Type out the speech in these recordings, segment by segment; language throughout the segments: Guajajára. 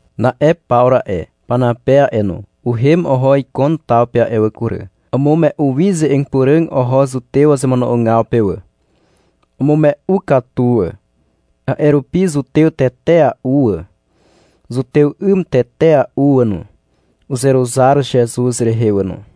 Na'e Pawru a'e, Panape a'e no, uhem oho Ikon taw pe a'e wà kury. Umume'u wi ze'eg puràg oho zutew wazemono'ogaw pe wà. Umume'u katu wà. A'e rupi zutew tetea'u wà, zutew 'ym tetea'u wà no, uzeruzar Zezuz rehe wà no.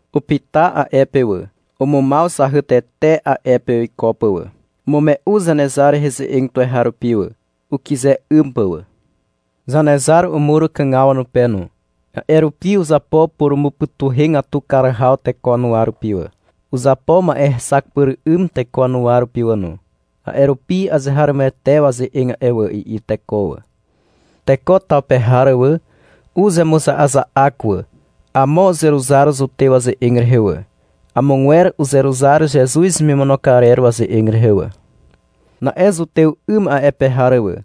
Upyta a'e pe wà. Umumaw zahy tete a'e pe wiko pà wà. Umume'u Zanezar rehe ze'eg tuweharupi wà, ukyze 'ym pà wà. Zanezar umur ukàgaw wanupe no. A'e rupi uzapo purumupytuhegatu kar haw teko wanuwa rupi wà, uzapo ma'e hexak pyr 'ym teko wanuwa rupi wà no. A'e rupi — Azeharomoete waze'eg a'e wà, i'i teko wà. Teko taw pe har wà, uzemuza'aza'ak wà. Amo uzeruzar zutew waze'eg rehe wà. Amogwer uzeruzar Zezuz hemimono karer waze'eg rehe wà. Na'e zutew 'ym a'e pe har wà,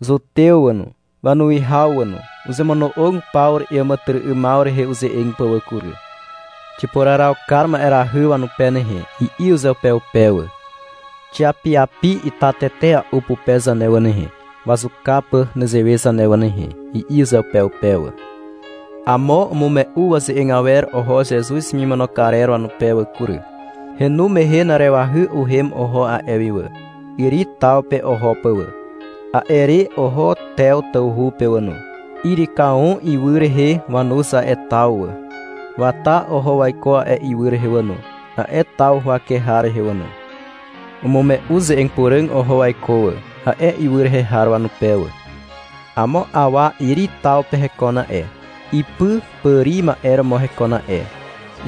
zutew wà no, wanuwihaw wà no, uzemono'og Pawru iàmàtyry'ymaw rehe uze'eg pà wà kury. -Xipuraraw kar ma'erahy wanupe nehe, i'i uzeupeupe wà. — Xiapiapi ita tetea'u pupe zane wà nehe, wazuka pà nezewe zane wà nehe, i'i uzeupeupe wà. Amo umume'u waze'eg awer oho Zezuz hemimono karer wanupe wà kury. Henu mehe na'arewahy uhem oho a'e wi wà, Iri taw pe oho pà wà. A'e re oho Tew tawhu pe wà no, Irikaon ywy rehe wanuz a'e taw wà. Wata oho waiko a'e ywy rehe wà no, a'e taw huwake har rehe wà no. Umume'u ze'eg puràg oho waiko wà, a'e ywy rehe har wanupe wà. Amo awa Iri taw pe hekon a'e. Ipy pàri ma'e romo hekon a'e.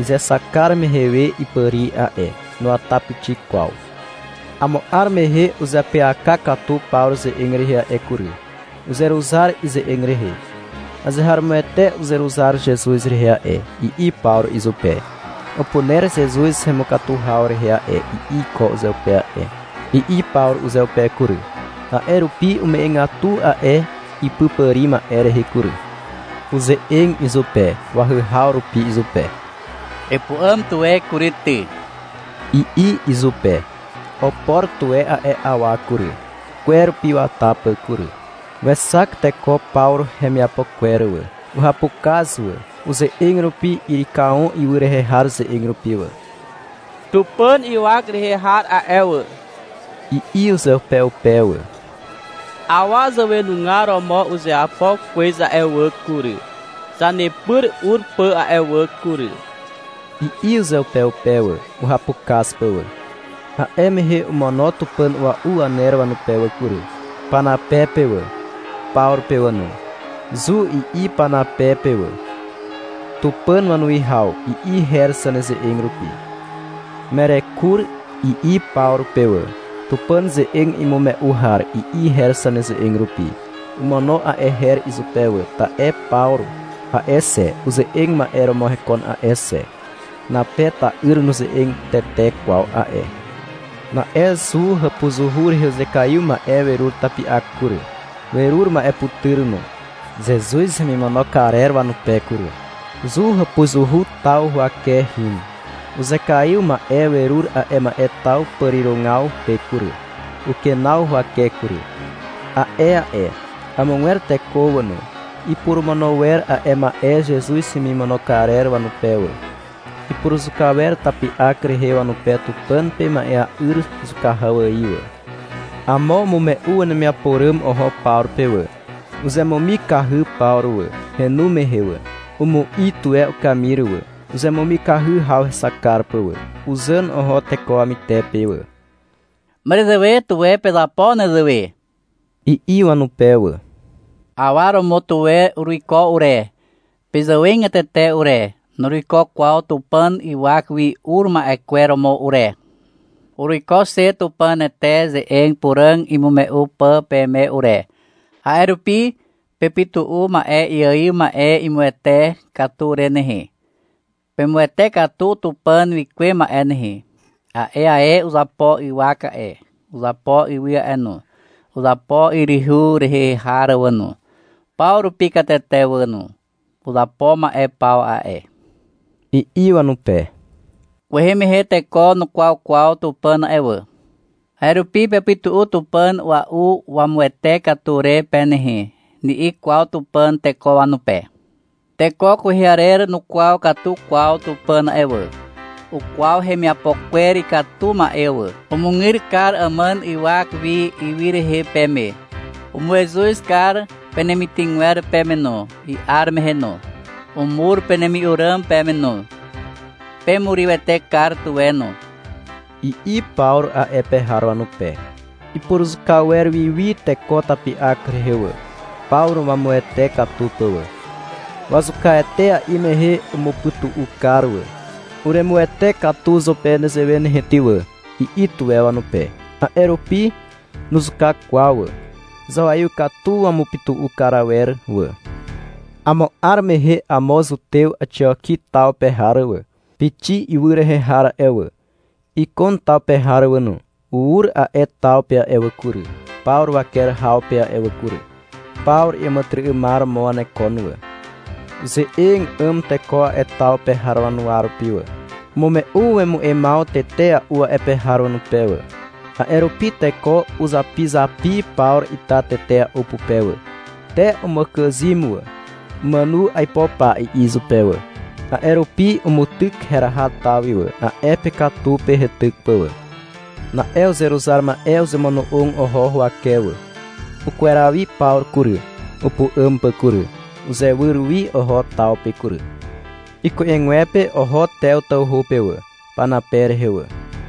Izexak kar mehe we ipàri a'e. Nuwata pixik kwaw. Amo 'ar mehe uzeapyaka katu Pawru ze'eg rehe a'e kury. Uzeruzar ize'eg rehe. — Azeharomoete uzeruzar Zezuz rehe a'e, i'i Pawru izupe. — Upuner Zezuz hemukatu haw rehe a'e, i'i iko uzeupe a'e, i'i Pawru uzeupe kury. A'e rupi ume'egatu a'e ipy pàri ma'e rehe kury. Uze'eg izupe, wahyhaw rupi izupe. -Epu'àm tuwe kury ty, i'i izupe. Opor tuwe a'e awa kury, kwe rupi wata pà kury. Wexak teko Pawru hemiapo kwer wà. Uhapukaz wà, uze'eg rupi Irikaon ywy rehe har ze'eg rupi wà. — Tupàn ywak rehe har a'e wà, i'i uzeupeupe wà, — Awa zàwenugar romo uzeapo kwez a'e wà kury, zanepyr ur pà a'e wà kury, i'i uzeupeupe wà, uhapukaz pà wà. A'e mehe omono tupàn a'ua'u waner wanupe wà kury, Panape pe wà, Pawru pe wà no. — Zu, i'i Panape pe wà. — Tupàn wanuwihaw, i'i her zaneze'eg rupi. — Merekur, i'i Pawru pe wà. — Tupàn ze'eg imume'u har, i'i her zaneze'eg rupi. Omono a'e her izupe wà, ta'e Pawru a'e xe, uze'eg ma'e romo hekon a'e xe. Nape ta'yr nuze'eg tete kwaw a'e. Na'e Zu hàpuzuhu rehe uzekaiw ma'e werur tapi'ak kury, werur ma'eputyr no, Zezuz hemimono karer wanupe kury. Zu hàpuzuhu taw huwake hin. Uzekaiw ma'e werur a'e ma'e taw pàrirogaw pe kury, ukenaw huwake kury. A'e a'e, amogwer teko wà no, iporomono wer a'e ma'e Zezuz hemimono karer wanupe wà. Ipuruzuka wer tapi'ak rehe wanupe Tupàn pe ma'ea'yr zuka haw ài wà. Amo umume'u wanemiapo ràm oho Pawru pe wà. Uzemumikahy Pawru wà, henu mehe wà. Umu'i tuwe ukamir wà, uzemumikahy haw hexak kar pà wà. Uzàn oho teko wamytepe wà. — Màràzàwe tuwe pezapo nezewe, i'i wanupe wà. — Awa romo tuwe uruiko ure, pezàwegatete ure. Nuruiko kwaw Tupàn ywak wi ur ma'e kwer romo ure. Uruiko xe Tupàn ete ze'eg puràg imume'u pà peme ure. A'e rupi pepytu'u ma'e iaiw ma'e imuwete katu re nehe. Pemuwete katu Tupàn wikuwe ma'e nehe. A'e ae uzapo ywak a'e, uzapo ywy a'e no, uzapo yryhu rehe har wà no, paw rupi katete wà no. Uzapo ma'e paw a'e, i'i wanupe. — Kwehe mehe teko nukwaw kwaw Tupàn a'e wà. A'e rupi — Pepytu'u tupàn a'ua'u wamuwete katu re pe nehe, ni'i kwaw Tupàn teko wanupe. Teko kwehe arer nukwaw katu kwaw Tupàn a'e wà. Ukwaw hemiapo kwer ikatu ma'e wà. Umugyr kar àmàn ywak wi ywy rehe peme. Umuezuz kar penemitygwer peme no, i'ar mehe no. Umur penemi'u ràm peme no. Pemurywete kar tuwe no, i'i Pawru a'e pe har wanupe. Ipuruzuka wer wi wi teko tapi'ak rehe wà, Pawru wamuwete katu pà wà. Wazuka etea'i mehe umupytu'u kar wà. — Uremuwete katu zo pe nezewe nehe ty wà, i'i tuwe wanupe. A'e rupi nuzuka kwaw wà. Zawaiw katu wamupytu'u kar awer wà. Amo 'ar mehe amo zutew Àxioki taw pe har wà, Pixi ywy rehe har a'e wà, Ikon taw pe har wà no, ur a'e taw pe a'e wà kury, Pawru waker haw pe a'e wà kury. (Pawru iàmàtyry'ymar romo wanekon wà.) Uze'eg 'àm teko a'e taw pe har wanuwa rupi wà. Umume'u wemu'emaw tetea'u a'e pe har wanupe wà. A'e rupi teko uzapizapi Pawru ita tetea'u pupe wà. Te umuàkàzym wà. — Umàno aipo pa, i'i izupe wà. A'e rupi umutyk heraha taw wi wà, a'e pe katu pe heityk pà wà. Na'e uzeruzar ma'e uzemono'og oho huwake wà. Ukweraw wi Pawru kury, upu'àm pà kury. Uzewyr wi oho taw pe kury. Iku'egwepe oho Tew tawhu pe wà, Panape rehe wà.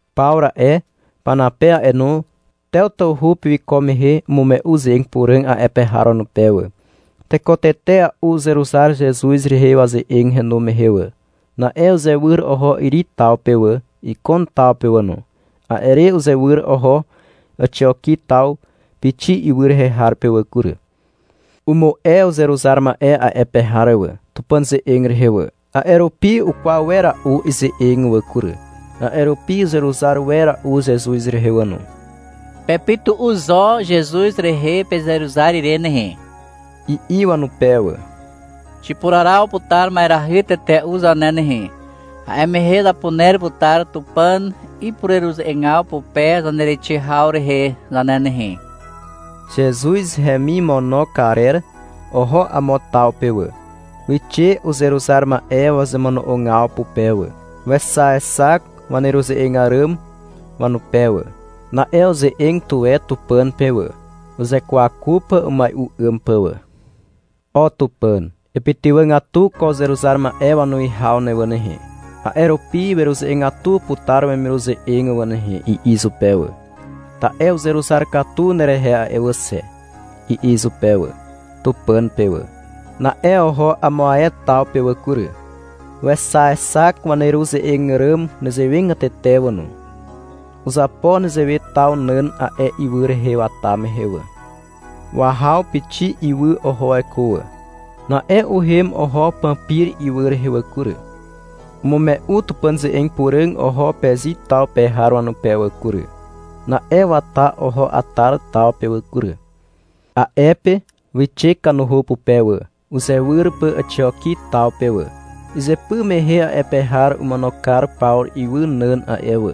Pawru a'e, Panape a'e no, Tew tawhu pe wiko mehe umume'u ze'eg puràg a'e pe har wanupe wà. Teko tetea'u uzeruzar Zezuz rehe waze'eg henu mehe wà. Na'e uzewyr oho Iri taw pe wà, Ikon taw pe wà no. A'e re uzewyr oho Àxioki taw Pixi ywy rehe har pe wà kury. Umu'e uzeruzar ma'e a'e pe har wà, Tupàn ze'eg rehe wà. A'e rupi ukwaw wera'u ize'eg wà kury. A'e rupi uzeruzar wera'u Zezuz rehe wà no. -Pepytu'u zo Zezuz rehe pezeruzar ire nehe, i'i wanupe wà. — Xipuraraw putar ma'erahy tetea'u zane nehe, a'e mehe zapuner putar Tupàn ipureruze'egaw pupe zanereixe haw rehe zane nehe. Zezuz hemimono karer oho amo taw pe wà. Wixe uzeruzar ma'e wazemono'ogaw pupe wà. Wexaexak waneruze'eg àràm wanupe wà. Na'e uze'eg tuwe Tupàn pe wà, uzekwaku pà umai'u 'ym pà wà. — O Tupàn, epytywàgatu ko uzeruzar ma'e wanuwihaw ne wà nehe. A'e rupi weruze'egatu putar wemiruze'eg wà nehe, i'i izupe wà. — Ta'e uzeruzar katu nerehe a'e wà xe, i'i izupe wà, Tupàn pe wà. Na'e oho amo ae taw pe wà kury. Wexaexak waneruze'eg àràm nezewegatete wà no. Uzapo nezewe taw nàn a'e ywy rehe wata mehe wà. Wahaw Pixi ywy oho waiko wà. Na'e uhem oho Pampir ywy rehe wà kury. Umume'u Tupàn ze'eg puràg oho Pezi taw pe har wanupe wà kury. Na'e wata oho Atar taw pe wà kury. A'e pe wixe kanuhu pupe wà, uzewyr pà Àxioki taw pe wà. Izypy mehe a'e pe har omono kar Pawru ywy nàn a'e wà.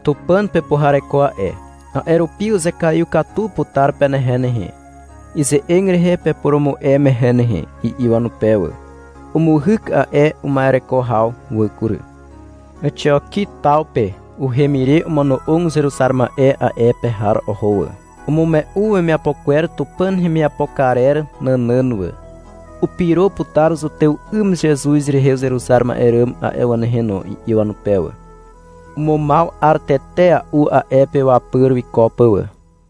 — Tupàn pepuhareko a'e. A'e rupi uzekaiw katu putar penehe nehe, ize'eg rehe pepurumu'e mehe nehe, i'i wanupe wà. Umuhyk a'e uma'ereko haw wà kury. Àxioki taw pe uhem ire omono'og uzeruzar ma'e a'e pe har oho wà. Umume'u wemiapo kwer Tupàn hemiapo karer nànàn wà. — Upyro putar zutew 'ym Zezuz rehe uzeruzar ma'e ràm a'e wà nehe no, i'i wanupe wà. Umumaw 'ar tetea'u a'e pe wapyr wiko pà wà.